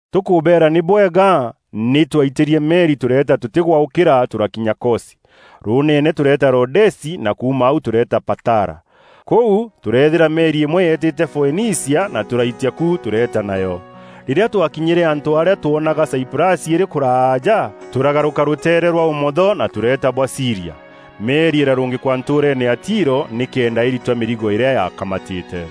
Tûkûbeera nî bwega, nî twaitîrie meri tûreeta tûtîgwaûkîra tûrakinya Kosi. Rûûneene tûreeta Rodesi na kuuma au tûreeta Patara. Kûu, tûreethîra meri îmwe yeetîte Foenicia na tûraitia ku tûreeta nayo. Rîrîa twakinyîre antû arîa twoonaga Saiprasi îrî kûraaja, tûragarûka rûteere rwa ûmotho na tûreeta bwa Sîria. Meri îrarûngîkwa ntûûreene ya Tiro nîkenda îritwa mîrigo îrîa yaakamatîte.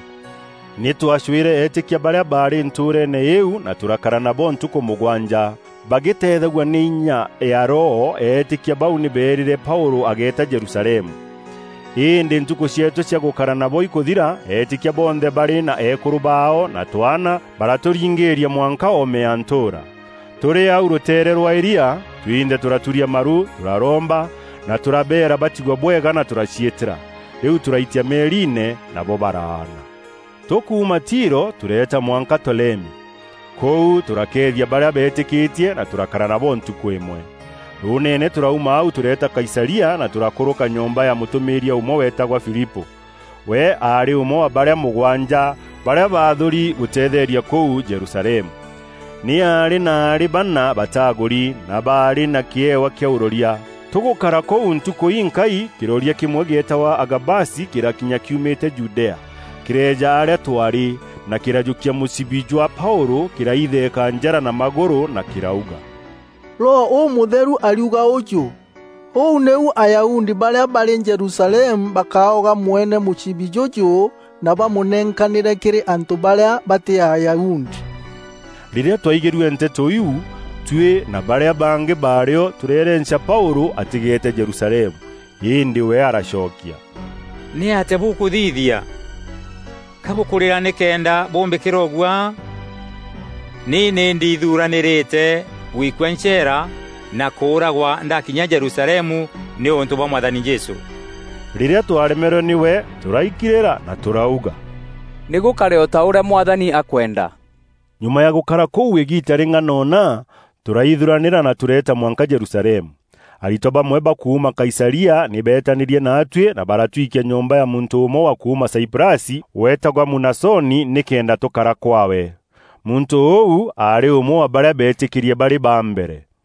Nî twaacûîre eetîkia barîa baarî ntûûreene îîu na tûrakara nabo ntukû mûgwanja. Bagîteethagua nî inya ya Roho, eetîkia bau nî beerîre Paûlû agéeta Jerusalemu. Îndî ntukû cieetû cia gûkara nabo ikûthira, eetîkia bonthe barî na eekûrû baao na twaana baratûringîîria mwanka oome ya ntûûra. Tûrî au rûteere rwa îria, twinthe tûraturia maru tûraromba na tûrabeera batigwe bwega na tûraciîtîra. Rîu tûraitia meeriine, nabo baraana. Tûkuuma Tiro tûreeta mwanka Tolemi. Kûu tûrakeethia barîa beetîkîtie na tûrakara nabo ntukû îmwe. Rûûneene, tûrauma au tûreeta Kaisaria na tûrakûrûka nyomba ya mûtûmîîria ûmwe weetagwa Filipû. We aarî ûmwe wa barîa mûgwanja, barîa baathûûri gûteethereria kûu Jerusalemu. Nî aarî na aarî bana bataagûri, na baarî na kîewa kîa ûroria. Tûgûkara kûu ntukû inkaai, kîroria kîmwe gîetagwa Agabasi kîrakinya kîumîte Judea. Kîreeja arîa twaarî, na kîrajûkia mûcibi jwa Paûlû, kîraitheeka njara na magûrû, na kîrauga, “Roho Ûmûtheru ariuga ûjû: ‘Ûu nîu Ayahudi barîa barî Jerusalemu bakaoga mwene mûcibi jûjû na bamûnenkanîre kîrî antû barîa batî Ayahudi.’” Rîrîa twaigîrue nteto iu, tuî na barîa bangî baarî o, tûreerenca Paûlû atîgeete Jerusalemu. Îndî we aracokia, “Nîatîa bûkûthithia? Ka bûkûrîra nîkenda bûmbîkîra ûguaa? Ni nî ndiithuranîrîte, guikua ncheera na kûûragwa ndakinya Jerusalemu, nîûntû bwa Mwathani Jesû.” Rîrîa twaaremerwe nîwe, tûraikirîra na tûrauga, “Nî gûkare o ta ûrîa Mwathani akwenda.” Nyuma ya gûkara kûu îgiita rîng'anona, tûraithuranîra na tûreeta mwanka Jerusalemu. Aritwa bamwe ba kuuma Kaisaria nî beetanîrie naatuî na baratwikia nyomba ya muntû ûmwe wa kuuma Saiprasi, weetagwa Munasoni, nîkenda tûkara kwaawe. Muntû ûu aarî ûmwe wa barîa beetîkîrie barî ba mbere.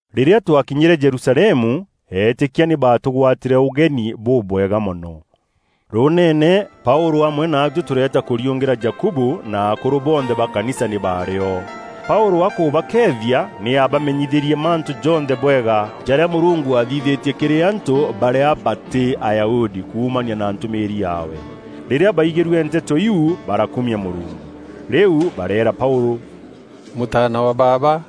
Rîrîa twakinyîre Jerusalemu, eetîkia nî baatûgwatîre ûgenî bûbwega mono. Rûûneene Paûlû amwe naatuî tûreeta kûriûngîra Jakubu; na akûrû bonthe ba kanisa nî baarî o. Paûlû akûbakeethia, nî aabamenyithîrie mantû jonthe bwega, jarîa Mûrungu aathithîtie kîrî antû barîa batî Ayahudi kuumania na ntûmîîri yaawe. Rîrîa baigîrue nteto iu barakumia Mûrungu. Rîu bareera Paûlû, “Mûtaana wa baaba,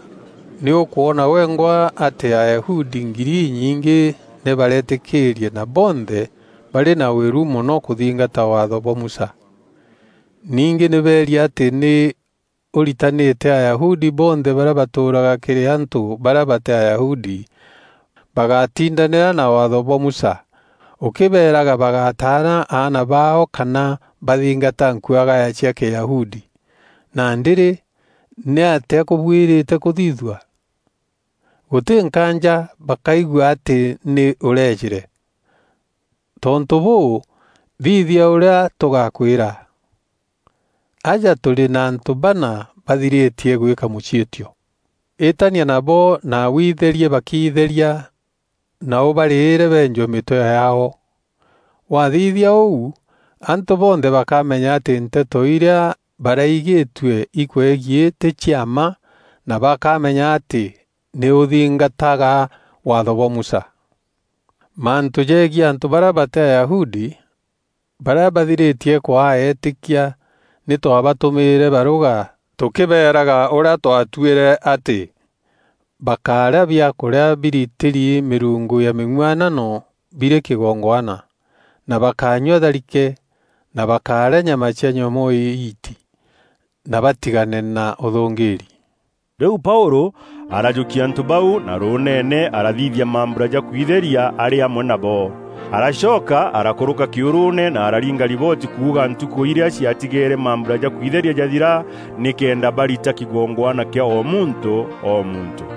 nî ûkwona wengwa atî Ayahudi ngiri inyingî nî baretîkîrie na bonthe barî na wîru mono kûthingata Waatho bwa Musa. Ningî nî beeri atî nî ûritanîte Ayahudi bonthe barîa batûûraga kîrî antû barîa batî Ayahudi, bagátindanîra na Waatho bwa Musa, ûkîbeeraga bagátaana aana baao kana bathingata nkuagaya cia Kîyahudi. Nandî rî, nîatîa kûbuîrîte kûthithua? Gûtî nkaanja bakaigua atî nî ûreejîre. Tontû bûû, thithia ûrîa tûgakwîra. Aja tûrî na antû bana bathirîtie gwîka mûciîtio. Îtania nabo na wiitherie bakiitheria na ûbarîîre beenjwe mîtwe yaao. Waathithia ûu, antû bonthe bakamenya atî nteto irîa baraigîtue ikwegiî tî cia mma na bakamenya atî nî ûthingataga Waatho bwa Musa. Mantû jegiî antû barîa batî Ayahudi, barîa bathirîtie kwaa eetîkia nî twaabatûmîîre barûga tûkîbeeraga ûrîa twaatuîre atî: bakárîa biakûrîa biritîrî mîrungu ya mîng'uanano birî kîgongwana; na bakányua tharike; na bakárîa nyama cia nyomoo îiiti; na batigane na ûthûngîîri.” Rîu Paûlû arajûkia antû bau, na rûûneene arathithia mambura ja kwitheria arî amwe nabo. Aracoka arakûrûka kîûrûûne na araringa ribooti kuuga ntukû irîa ciatigeere mambura ja kwitheria jathira, nîkenda barita kîgongwana kîa o muntû o muntû.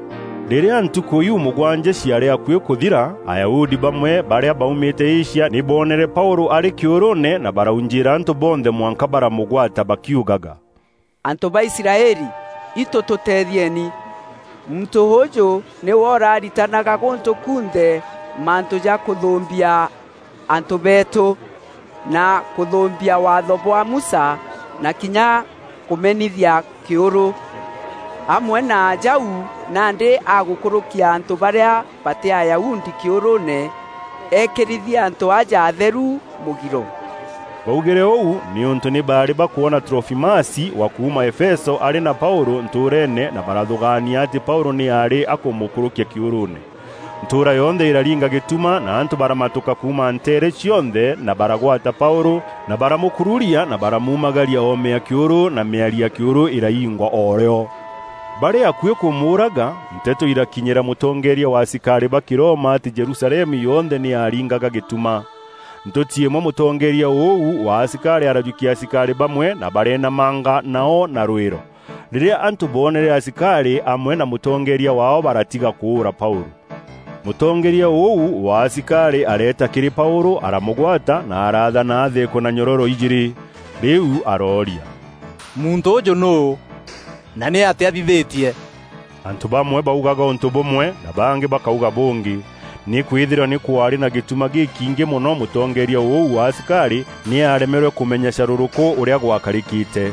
Rîrîa ntukû iu mûgwanja ciaarî akuî kûthira, Ayahudi bamwe barîa baaumîte Asia nî boonere Paûlû arî kîûrûûne na baraujîîra antû bonthe mwanka baramûgwata bakiugaga, “Antû ba Israeli, itû tûteethieni! Muntû ûûjû nîwe ûraritanaga gûntû kunthe mantû ja kûthûûmbia antû beetû, na kûthûûmbia Waatho bwa Musa na kinya kûmenithia kîûrû. Amwe na jau, nandî agûkûrûkia antû barîa batî Ayahudi kîûrûûne eekîrithia antû aja atheru mûgiro.” Baaugîre ûu nîûntû nî baarî bakwona Trofimasi wa kuuma Efeso arî na Paûlû ntûûreene na barathûgaania atî Paûlû nî aarî akûmûkûrûkia kîûrûûne. Ntûûra yonthe îraringa gîtuma na antû baramatûka kuuma nteere cionthe na baragwata Paûlû, na baramûkururia na baramuumagaria oome ya kîûrû na mîari ya Kîurû îraingwa o rîo. Barî akuî kûmûûraga, nteto irakinyîra mûtongeeria wa asikarî ba Kîroma atî Jerusalemu yonthe nî yaaringaga gîtuma. Ntûti îmwe mûtongeeria ûu wa asikarî arajûkia asikarî bamwe na bareenamanga nao na rwîro. Rîrîa antû boonere asikarî amwe na mûtongeeria waao baratiga kûûra Paûlû. Mûtongeeria ûu wa asikarî areeta kîrî Paûlû aramûgwata na araathana atheekwe na nyororo ijîîrî. Rîu arooria, “Muntû ûûjû nûû, na nî atîa athithîtie?” Antû bamwe baaugaga ûntû bûmwe, na bangî bakauga bûngî. Nîkwîthîrwa nî kwaarî na gîtuma gîkiingî mono mûtongeeria ûu wa asikarî nî aaremerwe kûmenya carûrûkû ûrîa gwakarîkîte.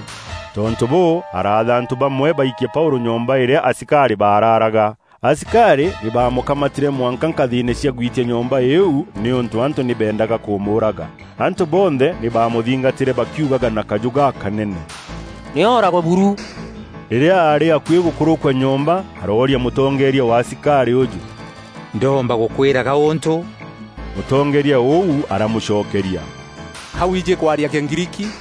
Tontû bûû, araatha antû bamwe baikie Paûlû nyomba îrîa asikarî baararaga. Asikarî nî baamûkamatîre mwanka nkathîîne cia gwîtia nyomba îîu, nîûntû antû nî beendaga kûmûûraga. Antû bonthe nî baamûthingatîre bakiugaga na kajû gakanene, “Nî ooragwe buru!” Rîrîa aarî akuî gûkûrûkua nyomba, arooria mûtongeeria wa asikarî ûjû, “Ndoomba gûkwîra gaûntû?” Mûtongeeria ûu aramûcokeria, “Ka wiijî kwaria Kîgriiki?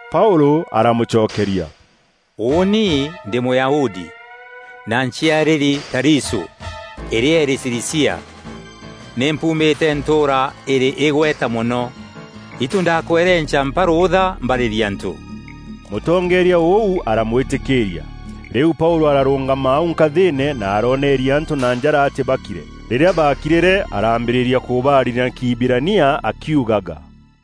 Paûlû aramûcokeria, “Ûûni ndî Mûyahudi, na nciarîri Tarisû, îrîa îrî Cilicia. Ni mpuumîte ntûûra îrî îgweta mono. Itû ndakwerenca mpa rûûtha mbarîrie antû.” Mûtongeeria ûu aramwîtîkîîria. Rîu Paûlû ararûngama au nkathîîne na aroneeria antû na njara atî bakîre. Rîrîa baakirîre, arambîrîria kûbaarîria na Kîhibirania akiugaga: